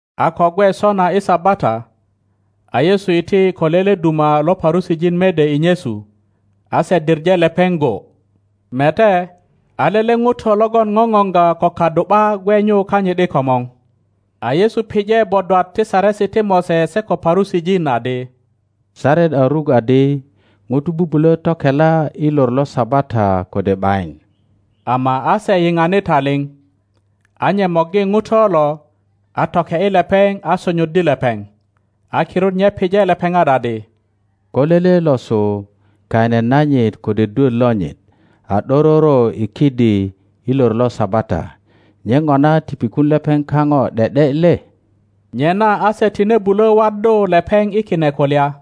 A ko gwe sona i Sabata, a Yesu iti ko lele duma lo Parusijin mede i nyesu, a se diŋe lepeŋ go, Mete, a lele ŋuto logon ŋoŋoŋga ko kadu ’ba gwe nyu kanyit i komor. A Yesu pije bodwat ti Saresi ti Mose se ko Parusijin adi, Saret a ruk adi ŋutu bubulo tokela i lor lo Sabata kode ’bayin? Ama a se yiŋani taliŋ. A nye morgi ŋuto lo, a toke ’yi lepeŋ a sonyoddi lepeŋ. A kirut nye pije lepeŋat adi, Ko lele losu kaine nanyit kode dwöt lonyit a ’dororo i kidi i lor lo Sabata, nye ŋona ti pikun lepeŋ kaŋo ’de ’de le? Nyena a se tine bulo waddu lepeŋ i kine kulya,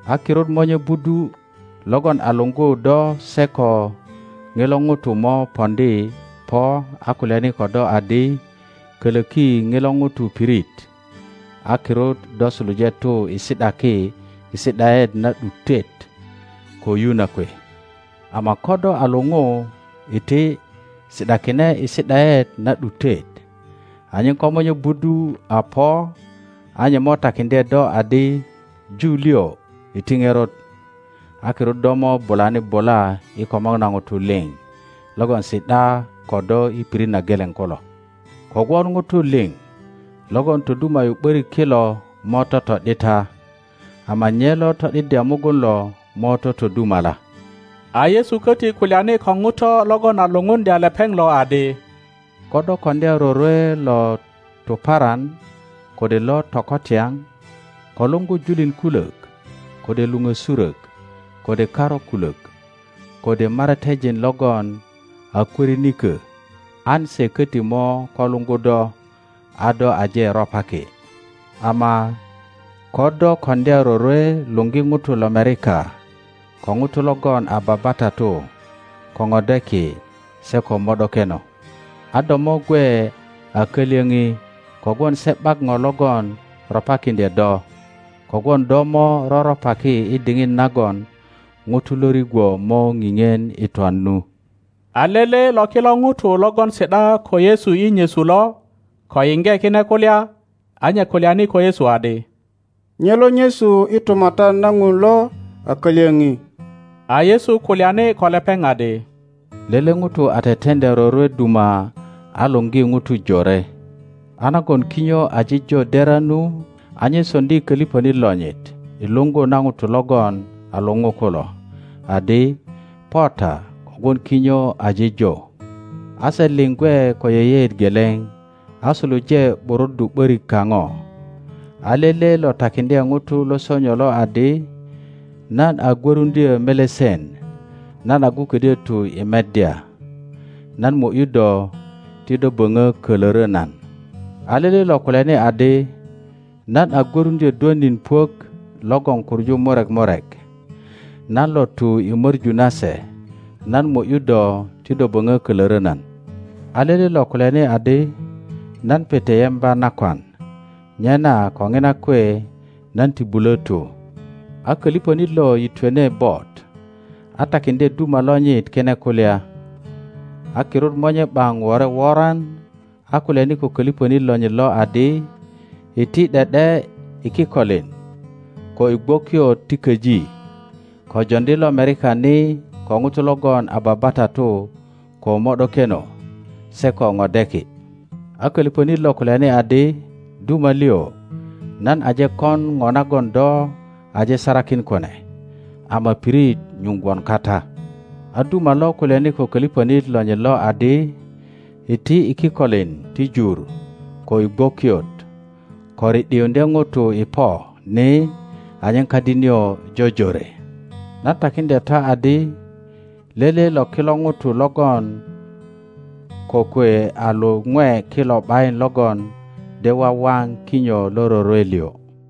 a kirut monye budu logon a luŋgu do se ko ŋilo ŋuto mo poŋdi po a kulyani ko do adi, Kölöki ŋilo ŋuto pirit, a kirut do suluje tu i si ’daki i si ’daet na ’dutet ko yu na kwe. Ama ko do a luŋu, iti, si ’dakine i si ’daet na ’dutet, anyen ko monye budu a po a nye mo takiŋdye do adi, Ju liŋ, iti ŋerot. A kirut do mo bulani bula i komor na ŋutu liŋ logon si ’da ko do i pirit na geleŋ kulo. Kogwon ŋutu liŋ logon toduma ’yu ’börik kilo mo toto ’dita, ama nye lo to ’diddya mugun lo mo totodumala. a Yesu koti kulyani ko ŋuto logon a lupuŋdya lepeŋ loadi, Ko do koŋdya rorwelotuparan kode lo tokotyaŋ, ko luŋgu julin kulök, kode luŋösurök, kode karu kulök, kode maratejin logon a kwörinikö, an se koti mo ko luŋgu do a do aje ropaki. Ama ko do koŋdya rorwe luŋgi ŋutu lomerika, ko ŋutu logon a babatatu, ko ŋodeki, se ko mo ’dokeno; a do mo gwe a kalyöŋi, kogwon se ’bak ŋo logon ropakiŋdye do; kogwon do mo roröpaki i diŋit nagon ijulu lo rigwo mo ŋiŋien i twan nu. A lele lo kilo ŋutu logon si ’da ko Yesu i nyesu lo, ko yiŋge kine kulya, a nye kulyani ko Yesu adi, Nye lo nyesu i Tumatyan na Ŋun lo a kalyoŋi! A Yesu kulyani ko lepeŋ adi, Lele ŋuto a teteŋdya rorwe duma a luŋgi ŋutu Jore. A nagon kinyo aje jo dera nu, a nye soŋdi koliŋonit lonyit i luŋgu na ŋutu logon a luŋu kulo, adi, Po ta, kogwon kinyo aje jo. A se liŋ gwe ko yeyeet geleŋ a suluje ’buruddu ’borik kaŋo. A lele lo takiŋdye ŋuto lo sonyo lo adi, Nan a gwöruŋdyo melesen; nan agu ködyö tu i meddya. Nan mo ’yu do ti do böŋö kölörö nan a lele lo kulyani adi, Nan a gwöruŋdyö dwönin puök logon kuŋu murek murek. Nan lo tu i möŋu na se. Nan mo ’yu do ti do boŋö kölörö nan. a lele lo kulyani adi, Nan pete yemba nakwan, nyena ko ŋina kwe nan ti bulo tu. A koliŋonit lo yitwene bot a takiŋdye duma lonyit kine kulya. A kirut monye ’baŋ wore woran, a kulyani ko koliŋönit lonyit lo adi, Iti ’de ’de i kikolin ko i gwokiot ti köji, ko joŋdi lomerika ni, ko ŋutu logon a babatatu, ko mo ’dokeno se ko ŋodeki. a koliŋönit lo kulyani adi, Duma liŋ, nan aje kon ŋo nagon do aje sarakin kune, ama pirit nyuŋ gwon kata. a duma lo kulyani ko koliŋönit lonyit lo adi, Iti i kikolin ti jur ko i gwokiot, ko ri ’diuŋdye ŋutu i po ni, anyen kadi nio jojore. Nan takiŋdya ta adi, Lele lo kilo ŋutu logon kokwe a luŋwe kilo ’bayin logon de wawaŋ kinyo lo rorwe liŋ.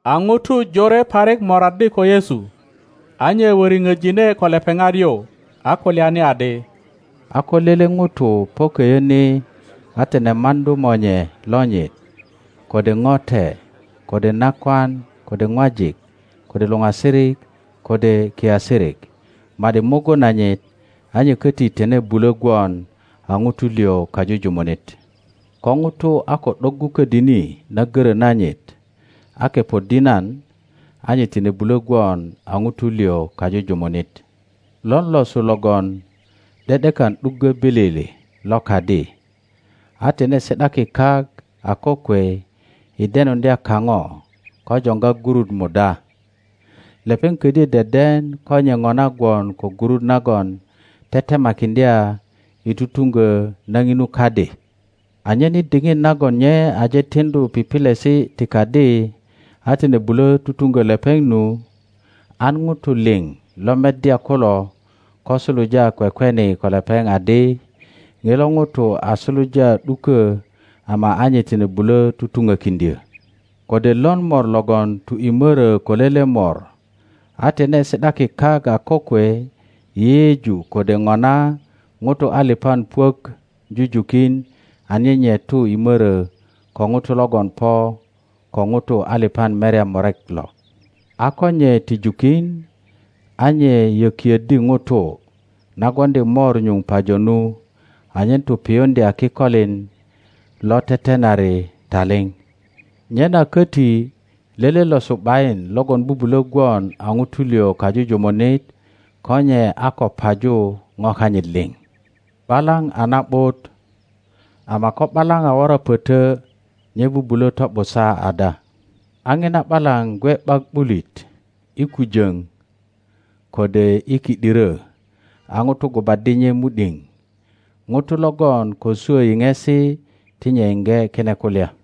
A ŋutu jore parik moraddi ko Yesu, a nye wöriŋo jine ko lepeŋat yu, a kulyani adi, a ko lele ŋuto po koyo ni a tine maŋdu monye lonyit, kode ŋote, kode nakwan, kode ŋwajik, kode luŋasirik, kode kiasirik, ma ’di mugun nanyit, a nye koti tine bulo gwon a ŋuto liŋ kajujumunit. Ko ŋuto a ko ’doggu ködini na goro nanyit a kepoddi nan, a nye tine bulö gwon a ŋuto liŋ kajujumunit. Lon losu logon ’de ’dekan ’duggö bilili lo kadi, a tine si ’daki kak a kokwe i denuŋdya kaŋo ko joŋga gurut muda? Lepeŋ ködyö deden ko nye ŋona gwon ko gurut nagon tetemakiŋdya i tutuŋgö na ŋinu kadi, anyen i diŋit nagon nye aje tiŋdu pipilesi ti kadi a tine bulo tutuŋgö lepeŋ nu, an ŋutu liŋ lo meddya kulo ko suluja kwekweni ko lepeŋ adi, Ŋilo ŋuto a suluja ’duko ama a nye tine bulö tutuŋokiŋdyö. Kode lon mor logon tu i mörö ko lele mor, a tine si ’daki kak a kokwe i yeyeju kode ŋona ŋutu aliŋan puök jujukin anyen nye tu i mörö ko ŋuto logon po ko ŋutu aliŋan merya murek lo? a ko nye ti jukin, a nye yökioddi ŋutu, na gwoŋdi mor nyuŋ pajo nu, anyen tu piyuŋdya kikolin lo tetenari taliŋ. Nyena koti lele losu ’bayin logon bubulo gwon a ŋuto liŋ kajujumunit ko nye a ko paju ŋo kanyit liŋ. ’Balaŋ a na ’but, ama ko ’balaŋ a wora poto, nye bubulö to ’busa ada? A ŋina ’balaŋ gwe ’bak ’bulit i kujoŋ kode i ki ’diro, a ŋutu gubaddi nye mu ’diŋ ŋuto logon ko swo yiŋesi ti nye yiŋge kine kulya.